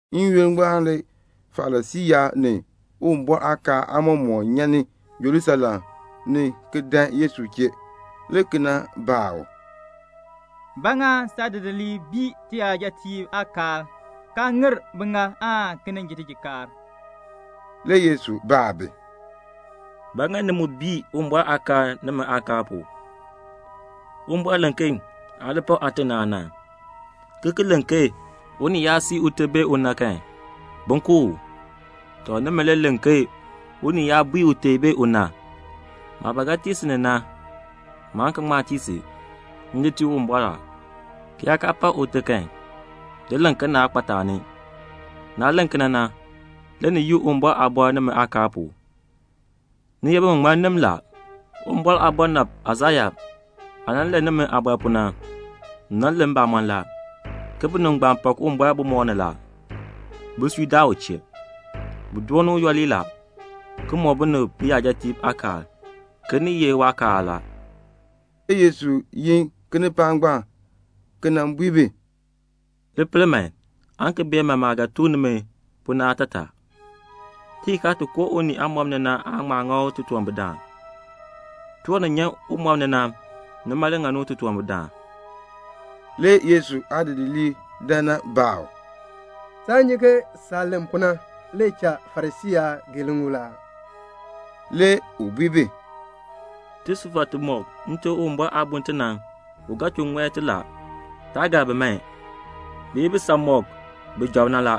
N-yoonn ngbaan le Farisii yaab ni Uwumbɔr aakaal aamɔmɔkb nyan ni Jerusalem le ki dan Yesu chee, le ki nan baa u, "Ba ŋa saadidiliib bii tiyajatiib aakaal, kaa ŋir biŋaal aan ki nin ji tijikaar?" Le Yesu baa bi, "Ba ŋa ni mu bii Uwumbɔr aakaal nimi aakaal pu? Uwumbɔr len ke 'Aa li pak aate ni aana', ki ki len ke 'Unii yaa sii ute bee una kan, bin ku u.' Nimi, ni len ke unii yaa bui ute bee una, 'Maah ba ga tii si ni na, maan ki ŋma tii si. M di tii Uwumbɔr la', ki yaa kaa pak ute kan, nimi le len ke naa kpa taani. Naah len kena na, le ni yii Uwumbɔr aaliin nimi aakaal pu. Ni ye biŋmaŋmannim la. Uwumbɔr aabɔnabr Aisaya aah nan len nimi aabɔr na, u len mbamɔn la, ke 'Binib ngbaan pak Uwumbɔr bumɔb ni la. Bisui daa u chee. Bi dooni u yooli la, ki mɔk binib biyajatiib aakaal ke ni ye waakaal la."' Le Yesu yin kinipaak ngbaan, le ki bui bi, "Li pel man, aan ki bee man maah ga tuk nimi pu na aatataa. Tijikaar ti koo unii aamɔb ni na aan ŋma ŋa u titunwambirdaan. Tiwan ni nyan umɔb ni na, nima le ŋani u titunwambirdaan." Le Yesu aadidiliib dan nan baa u, "Aa nyi ke saah len pu na le cha Farisii yaab gee liŋuul aa?" Le u bui bi, "Tisufar timɔk Nte Uwumbɔr aa bun ti, u ga chuu ŋɔi ti la. Taa gar bi man. Bi ye bisanmɔkb bi job na la.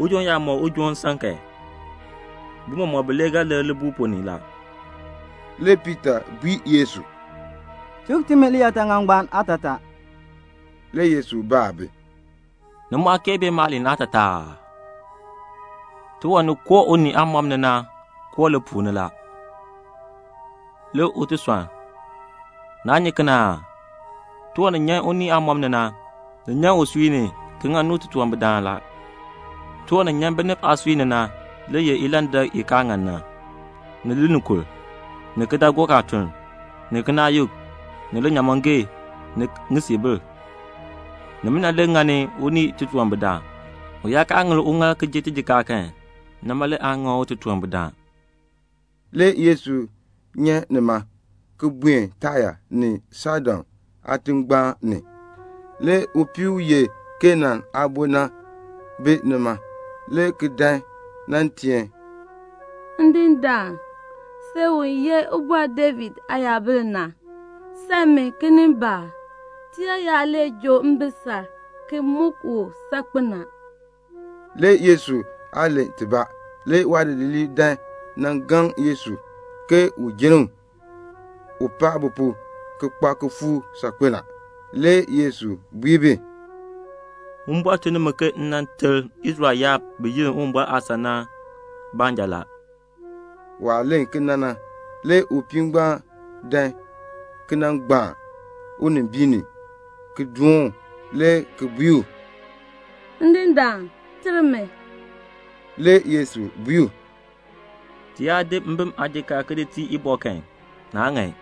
Ujoon yaa mɔk ujoon nsan kan, bi mɔmɔk bilee ga lir libuul ponn ni la." Le Piita bui Yesu, "Tuk timi liyaataŋakl ngbaan aatataa." Le Yesu baa bi, "Ni mu aa kee bee maaliin aatataa aa? Tiwan ni koo unii aamɔb ni na koo lipuul ni, le u ti sɔnn. Naa nyi kena aa? Tiwan ni nyan unii aamɔb ni na, ni nyan usui ni, ki ŋani u titunwambirdaan la. Tiwan ni nyan binib aasui ni na le ye ilandak i kaa ŋan na, ni linikur, ni kidaagook aatuln, ni kinaayuk, ni linyaamɔngee, ni ŋisiibil. Nimina le ŋani unii titunwambirdaan. U yaa kaa ŋir uŋaal le ki ji tijikaar kan, nima le aan ŋa u titunwambirdaan." Le Yesu nyan nima, le ki buen Taya ni Saidon aatingbaan ni. Le upii u ye Kanaan aabo na bi nima, le ki dan nan teen, "Ndindaan, si u ye Ubɔr David Aayabil na, sam mi kinimbaak. Tiyaayar le joo mbisal ki muk u saakpen a." Le Yesu aa len tibaa. Le waadidiliib dan nan gaŋ Yesu ke un jenn u, u paa bi pu ki kpa kifuuk saakpen a. Le Yesu bui bi, "Uwumbɔr tun ni mi ke m ter Israel yaab bi yenn Uwumbɔr aasan ni na baanja." Waah len kena na, le upii ngbaan dan ki nan gbaan unimbiin ni ki doon u, le ki bui u, "Ndindaan, ter mi." Le Yesu bui u, "Ti yaa di mbim aajikaar ki di tii ibɔ kan, naa ŋan."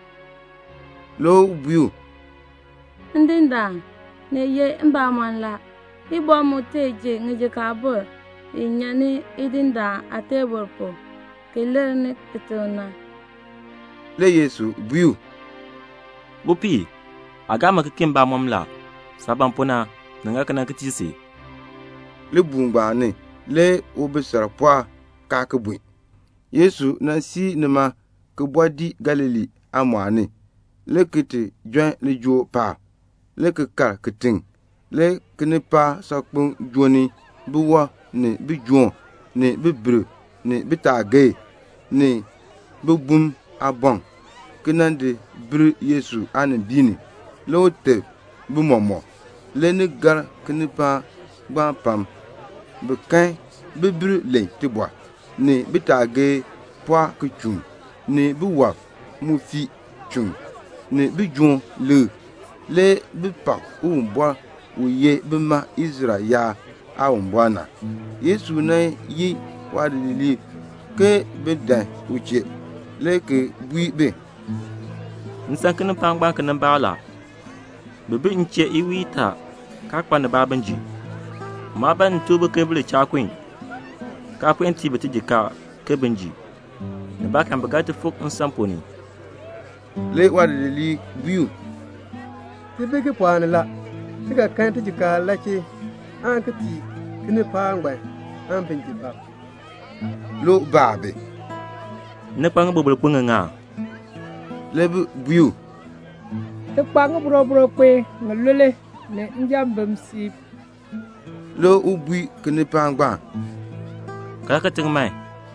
Le u bui u, "Ndindaan, ni ye mbamɔn la; ibɔ mu tee ji ŋijikaabur ŋi nyan ni idindaan aateebl pu ki lir kitiŋ na." Le Yesu bui u, "Upii, aa gaa mi ki kii mbamɔm la. Saah ban pu na, ni ŋa kena ki tii si." Libuul ngbaan ni le ubisal pɔɔk, kaa ki bun. Le Yesu siir nima ki bɔɔ dii Galilee aamɔɔl ni, le ki ti jon lijool paab, le ki kal kitiŋ. Le kinipaak saakpeŋ joo ni biwɔb, ni bijoom, ni bibirb, ni bitaagee, ni bibum aaboŋ, ki di nan di bil Yesu aanimbiin ni. Le u teb bi mɔmɔk. Le ni gar kinipaak ngbaan pam; bi kan bibirb len tibɔr, ni bitaagee pɔɔk ki chuun, ni biwɔb mu fii chuun, ni bijoom likr. Le bi pak Uwumbɔr, u ye bima Israel yaab Aawumbɔr na. Le Yesu yin waadidiliib ke bin dan u chee, le ki bui bi, "M san kinipaak ngbaan kinimbaak la; bi bi m chee iwiin itaa, kaa kpa nibaa bin ji. Maa ban m tuk bi ke bi li cha kun, kaa puen tii bi tijikaar ke bin ji. Nibaakan bi ga fik nsan ponn ni." Le waadidiliib bui u, "Ti bi kipɔɔk ni la. Ti ga kan tijikaar la chee aan ki tii kinipaak ngbaan aan bin ji bab?" Le u baa bi, "Ni kpa ŋiboroboro kpin ŋiŋa?" Le bi bui u, "Ti kpa ŋiboroboro kpin ŋilule ni njambim siib." Le u bui kinipaak ngbaan, "Kaln kitiŋ man,"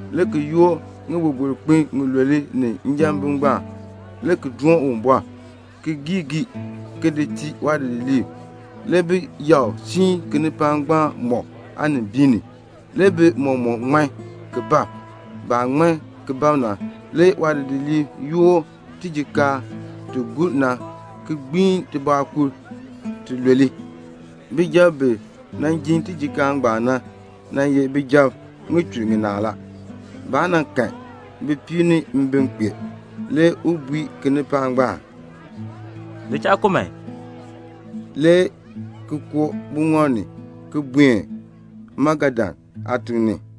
le ki yoor ŋiboroboro kpin ŋilule ni njambim ngbaan, le ki doon Uwumbɔr, le ki gii gii, le ki di tii waadidiliib. Le bi yakr ki siin kinipaak ngbaan mɔk aanimbiin ni. Le bi mɔmɔk ŋman ki bab. Baah ŋman ki bab na, le waadidiliib yoor tijikaar ti gur na, ki gbiin tibɔɔkur tilule. Bijab bi jin tijikaar ngbaan na, nan ye bijab ŋichur ŋinaa la. Baa kahn bipiib ni mbim kpee. Le u bui kinipaak ngbaan, "Li cha kun man," le ki koo buŋɔb ni, le ki buen Magadan aatiŋ.